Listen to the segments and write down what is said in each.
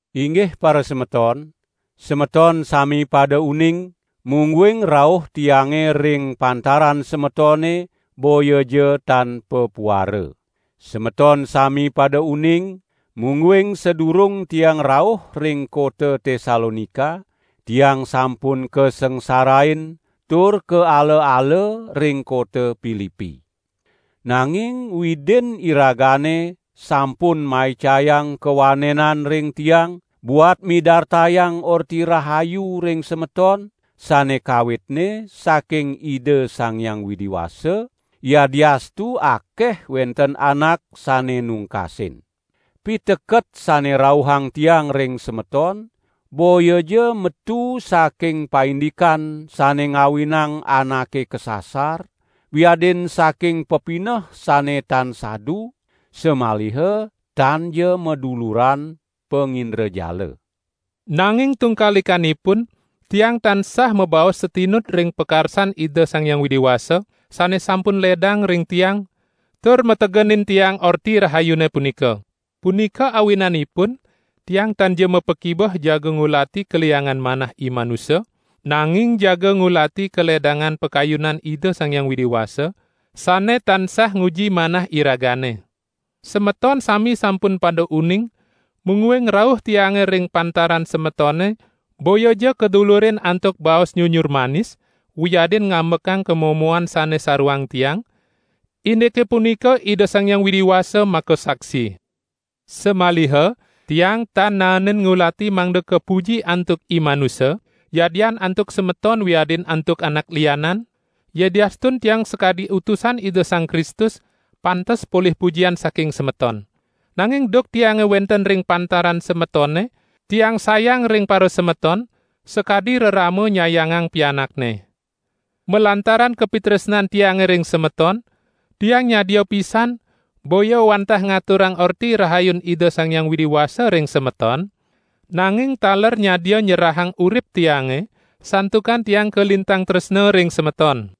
Inggih parasemeton, semeton sami pada uning, mungguing rauh tiange ring pantaran semetone boyaja tan papuara. Semeton sami pada uning, mungguing sadurung tiang rauh ring kota Tesalonika tiang sampun kasangsarain tur kaala-ala ring kota Pilipi. Nanging Widin iragane sampun maicayang kawanenan ring tiang buat midartayang Orti Rahayu ring semeton sane kawitne saking Ida Sang Hyang Widi Wasa, yadiastu akeh wenten anak sane nungkasin. Piteket sane rauhang tiang ring semeton boyaja metu saking paindikan sane ngawinang anake kasasar, wiadin saking pepineh sane tan sadu, samaliha tanja maduluran pangindrajala. Nanging tungkalikanipun, tiang tansah mabaos satinut ring pakarsan Ida Sang Hyang Widi Wasa, sane sampun ledang ring tiang, tur mategenin tiang Orti Rahayune punika. Punika awinanipun tiang tanja mapakibeh jaga ngulati kaliangan manah imanusa, nanging jaga ngulati kaledangan pakayunan Ida Sang Hyang Widi Wasa, sane tansah nguji manah iragane. Semeton sami sampun pada uning, mungguing rauh tiange ring pantaran semetone boyaja kadulurin antuk baos nyunyur manis wiadin ngambekang kamomoan sane saruang tiang; indike punika Ida Sang Hyang Widi Wasa makasaksi. Samaliha tiang tan naenin ngulati mangda kapuji antuk imanusa, yadian antuk semeton wiadin antuk anak lianan, yadiastun tiang sakadi utusan Ida Sang Kristus, pantes polih pujian saking semeton. Nanging duk tiange wenten ring pantaran semetone tiang sayang ring parasemeton, sakadi rerama nyayangang pianakne. Malantaran kapitresnan tiange ring semeton, tiang nyadia pisan, boya wantah ngaturang Orti Rahayun Ida Sang Hyang Widi Wasa ring semeton, nanging taler nyadia nyerahang urip tiange, santukan tiang kalintang tresna ring semeton!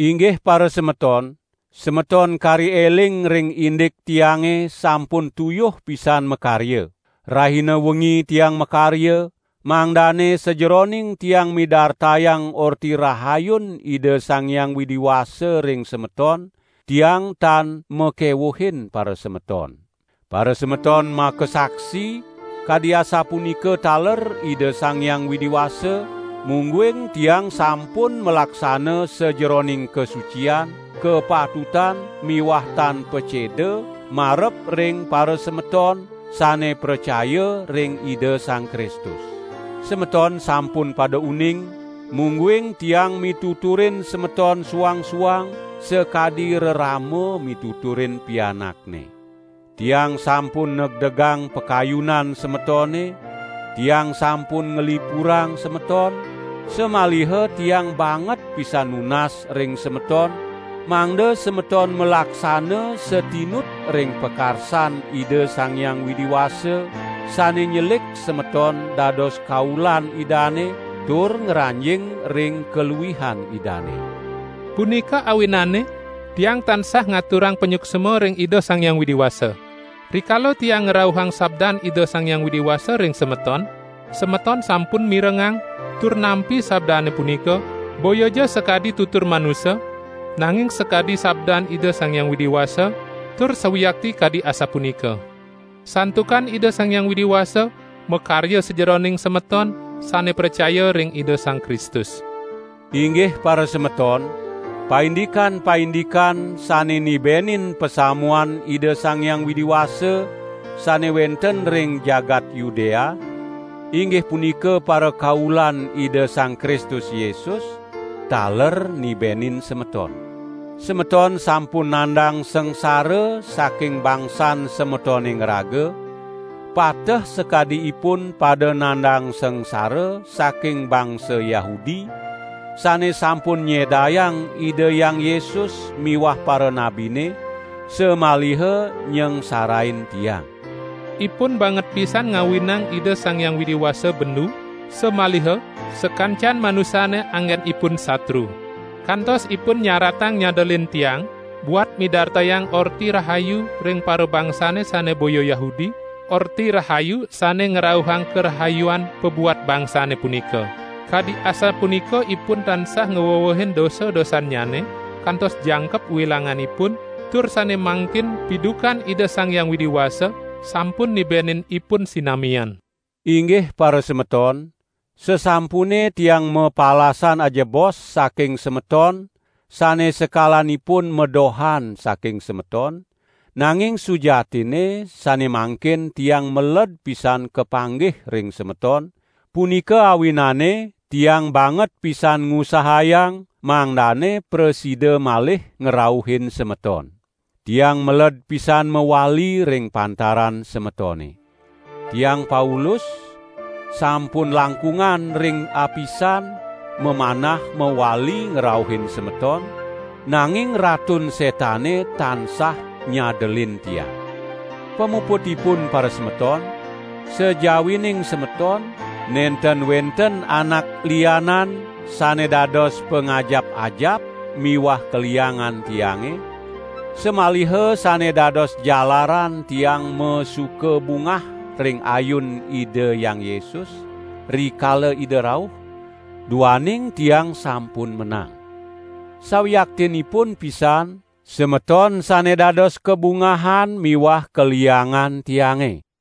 Inggih parasemeton, semeton kari eling ring indik tiange sampun tuyuh pisan makarya! Rahina wengi tiang makarya, mangdane sajeroning tiang midartayang Orti Rahayun Ida Sang Hyang Widi Wasa ring semeton, tiang tan makewuhin parasemeton. Parasemeton makasaksi, kadi asapunika taler Ida Sang Hyang Widi Wasa, mungguing tiang sampun malaksana sajeroning kasucian, kapatutan miwah tan paceda marep ring parasemeton sane pracaya ring Ida Sang Kristus. Semeton sampun pada uning, mungguing tiang mituturin semeton suang-suang sakadi rerama mituturin pianakne. Tiang sampun negdegang pakayunan semetone, tiang sampun nglipurang semeton, samaliha tiang banget pisan nunas ring semeton, mangda semeton malaksana satinut ring pakarsan Ida Sang Hyang Widi Wasa, sane nyelik semeton dados kaulan Idane tur ngranjing ring kaluihan Idane. Punika awinane, tiang tansah ngaturang panyuksma ring Ida Sang Hyang Widi Wasa. Rikala tiang ngrauhang sabdan Ida Sang Hyang Widi Wasa ring semeton, semeton sampun mirengang tur nampi sabdane punika, boyaja sakadi tutur manusa, nanging sakadi sabdan Ida Sang Hyang Widi Wasa, tur sawiakti kadi asapunika. Santukan Ida Sang Hyang Widi Wasa makarya sajeroning semeton, sane pracaya ring Ida Sang Kristus. Inggih parasemeton, paindikan-paindikan sane nibenin pasamuan Ida Sang Hyang Widi Wasa, sane wenten ring jagat Yudea, inggih punika parakaulan Ida Sang Kristus Yesus, taler nibenin semeton. Semeton sampun nandang sangsara saking bangsan semetone ngraga, pateh sakadi ipun pada nandang sangsara saking bangsa Yahudi, sane sampun nyedayang Ida Hyang Yesus miwah paranabine, samaliha nyangsarain tiang. Ipun banget pisan ngawinang Ida Sang Hyang Widi Wasa bendu, samaliha sakancan manusane anggenipun satru. Kantos ipun nyaratang nyadelin tiang, buat midartayang Orti Rahayu ring parabangsane sane boya Yahudi, Orti Rahayu sane ngrauhang karahayuan pabuat bangsane punika. Kadi asapunika ipun tansah ngwewehin dosa-dosannyane kantos jangkep wilanganipun, tur sane mangkin pidukan Ida Sang Hyang Widi Wasa sampun nibenin ipun sinamian. Inggih parasemeton, sasampune tiang mapalasan ajebos saking semeton sane sekalanipun madohan saking semeton, nanging sujatinne sane mangkin tiang meled pisan kapanggih ring semeton, punika awinane tiang banget pisan ngusahayang mangdane prasida malih ngrauhin semeton. Tiang meled pisan mawali ring pantaran semetone. Tiang Paulus, sampun langkungan ring apisan, mamanah mawali ngrauhin semeton, nanging Ratun Setane tansah nyadelin tiang. Pamuputipun parasemeton, sajawining semeton, nenten wenten anak lianan sane dados pangajap-ajap miwah kaliangan tiange, samaliha sane dados jalaran tiang masuka bungah ring ayun Ida Hyang Yesus, rikala Ida rauh, duaning tiang sampun menang. Sawiaktinipun pisan, semeton sane dados kabungahan miwah kaliangan tiange.